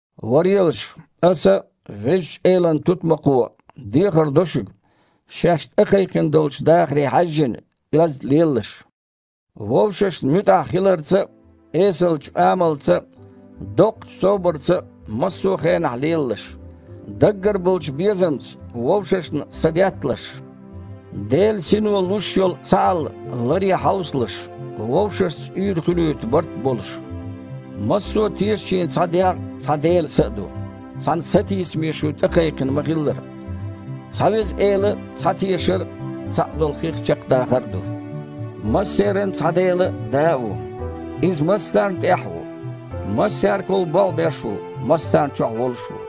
Варелаш, аса, Везачу Элан тутмакхо, дехар до шуьга, шаьш тІекхайкхина долчу дахаре хьаьжжина, оьзда лелалаш. Вовшашна муьтІахь хиларца а, эсалчу амалца а, доккхачу собарца а массо а хенахь лелалаш. Даггара болчу безамца вовшашна садетталаш. Делан Сино луш йолу цхьаалла ларъян хьовсалаш, вовшашца уьйр хуьлуьйту барт а болуш. Массо а тешачийн цхьа дегІ а, цхьа Делан Са а ду, цхьана сатийсаме шу тІекхайкхина ма-хиллара. Цхьа Веза Эла а, цхьа тешар а, цхьаъ долу хих чекхдахар а ду. Массеран цхьа Дела а, Да а ву. Иза массарна тІехь а ву, массаьргахула болх беш а ву, массарна чохь волуш а ву.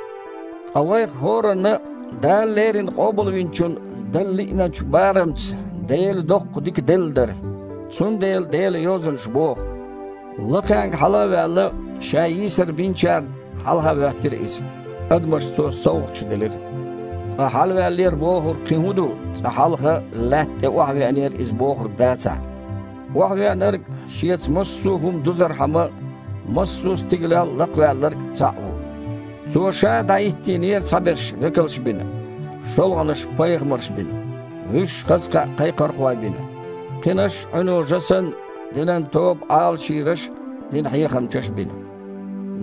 Ткъа вайх хІоранна Дала леррина Къобалвинчунна дала лиъначу барамца Делан доккха дика делла дара. Цундела Делан Йозанаша боху: «Лакхенга хьала а ваьлла, Ша йийсар биначарна хьалхахІоьттира Иза. Адамашна Цо совгІаташ делира». Ткъа «хьалаваьллера» бохург кхин хІун ду, цкъа хьалха лаьтта тІе охьавеанера Иза бохург дацахь? Охьавеанарг а, Шеца массо а хІума дузархьама, массо а стигалел Лакхаваьлларг а Цхьаъ ву. Цо Ша дІахІиттийнера цхьаберш векалш бина, шолгІанаш пайхамарш бина, вуьш хаза кхаъ кхайкхорхой бина, кхинаш, Іуьно жа санна, динан тоба Іалашйийраш а, динан хьехамчаш а бина.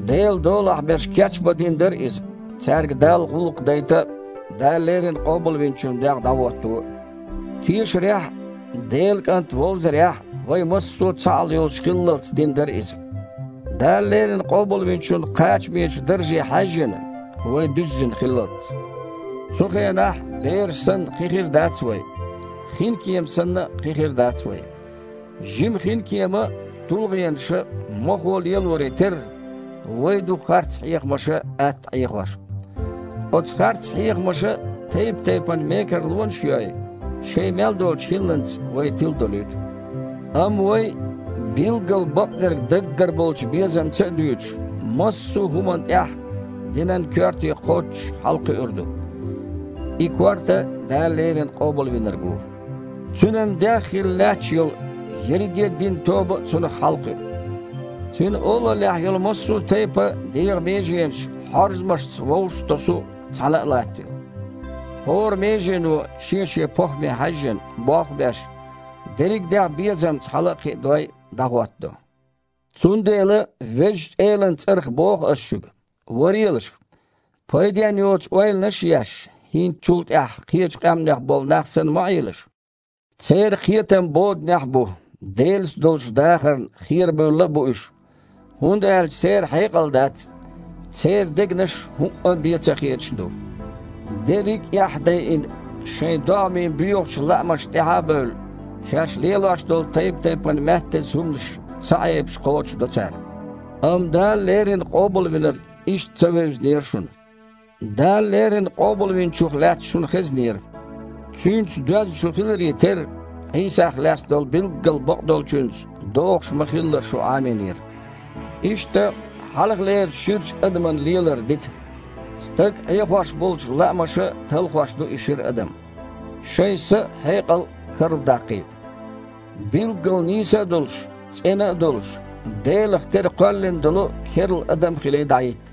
Делан долахь берш кечбан дина дара иза, цаьрга Далла гІуллакх дайта а, Дала леррина Къобалвинчун дегІ дІахІотто а. Тешарехь а, Делан КІант вовзарехь а вай массо а цхьаалла йолуш хиллалц дина дара иза, Дала леррина Къобалвинчун кхачамечу дарже хьаьжжина, вай дуьззина хиллалц. Цу хенахь, бераш санна, кхин хир дац вай, хинкема санна а, кхин хир дац вай. Жима хинкема тулгІенаша а, мохо а лелоре терра, вай а ду харц хьехамаша атта Іехош. Оцу харц хьехамаша тайп-тайпана мекарлонаш а йой, шайн мел долчу хІилланца вай тиладолуьйту. Амма вай, билггал бакъдерг даггара болчу безамца а дуьйцуш, массо а хІуманна тІехь динан коьрте кхоччуш хьалакхуьур ду. И корта – Дала леррина Къобалвинарг ву. Цуьнан дегІ хилла лаьтташ йолу ерриге а динан тоба а Цунах хьалакхуьу. Цуьнан олаллехь йолу массо а тайпана дегІан меженаш хьорзамашца вовшах а тосу, цхьаьна а латтайо. ХІора межено, шен-шен похІме хьаьжжина, болх а беш, дерриг а дегІ безамца хьала а кхиадой, дІахІоттадо. Цундела, Везачу Элан цІарах боху ас шуьга: варелаш, пайденна йоцу ойланаш а еш, хІинца чул тІаьхьа кхечу къаьмнех болу нах санна ма Іелаш. Церан кхетам боданехь а бу, Делаца долчу дахарна херабевлла а бу уьш, хІунда аьлча церан хьекъал а дац, церан дегнаш хІуъа а бен ца хеташ а ду. Дерриг эхь а дайина, шайн догІмийн боьхачу лаамашна тІаьхьа а бевлла, шаьш лелош долу тайп-тайпана маьттаза хІуманаш ца Іебаш кхочушдо цара. Амма Дала леррина Къобалвинарг иштта ца вевзинера шуна. Дала леррина Къобалвинчух лаьцна шуна хезнера. Цуьнца доьзна шу хиларе терра, Іийсах лаьцна долу билггал бакъдолчуьнца догІуш ма-хиллара шу Іамийнера. Иштта, хьалхалерчу ширачу адаман лелар дита. Стаг Іехош болчу лаамаша талхош ду и шира адам. Шайн са а, хьекъал а карладаккхийта. Билггал нийса а долуш, цІена а долуш, Делах тера кхоьллина долу керла адам а хилий, дІахІитта.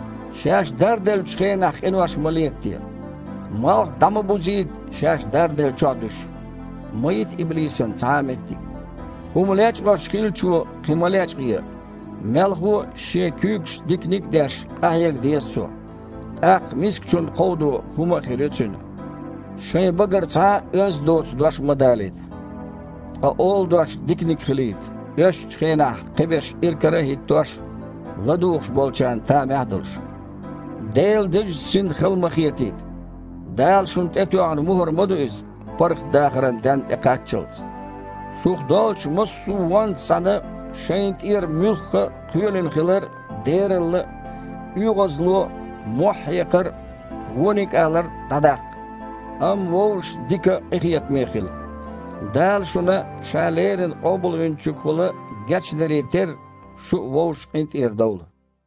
Шаьш дарделлачу хенахь къинош ма летаде. Малх дІа ма бузийта, шаьш дарделлачохь а дуьсуш. Ма йита иблисана цхьа а меттиг. ХІума лечкъош хиллачо кхин ма лечкъае. Мелхо а, шен куьйгашца диканиг а деш, къахьега деза цо. ТІаккха мискачунна кховдо хІума а хир ю цуьнан. Шайн багара цхьа а оьзда доцу дош ма далийта. Ткъа олу дош диканиг хилийта, оьшшучу хенахь кхиберш иракара а хІиттош, ладугІуш болчарна тамехь а долуш. Делан Дезачу Синна хала ма хетийта. Дала шуна тІе тоьхна мухІар ма ду Иза, паргІатдахаран денна тІекхаччалц. Шух доллучу массо а вонца цхьаьна шайна тІера муьлхха а кхоьлина хилар а, дералла а, оьгІазло а, мохь хьекхар а, вониг алар а дІадаккха. Амма вовшашца дика а, къинхетаме а хила. Дала шуна Ша леррина Къобалвинчуьнгахула гечдаре терра, шу а вовшашна къинтІера довла.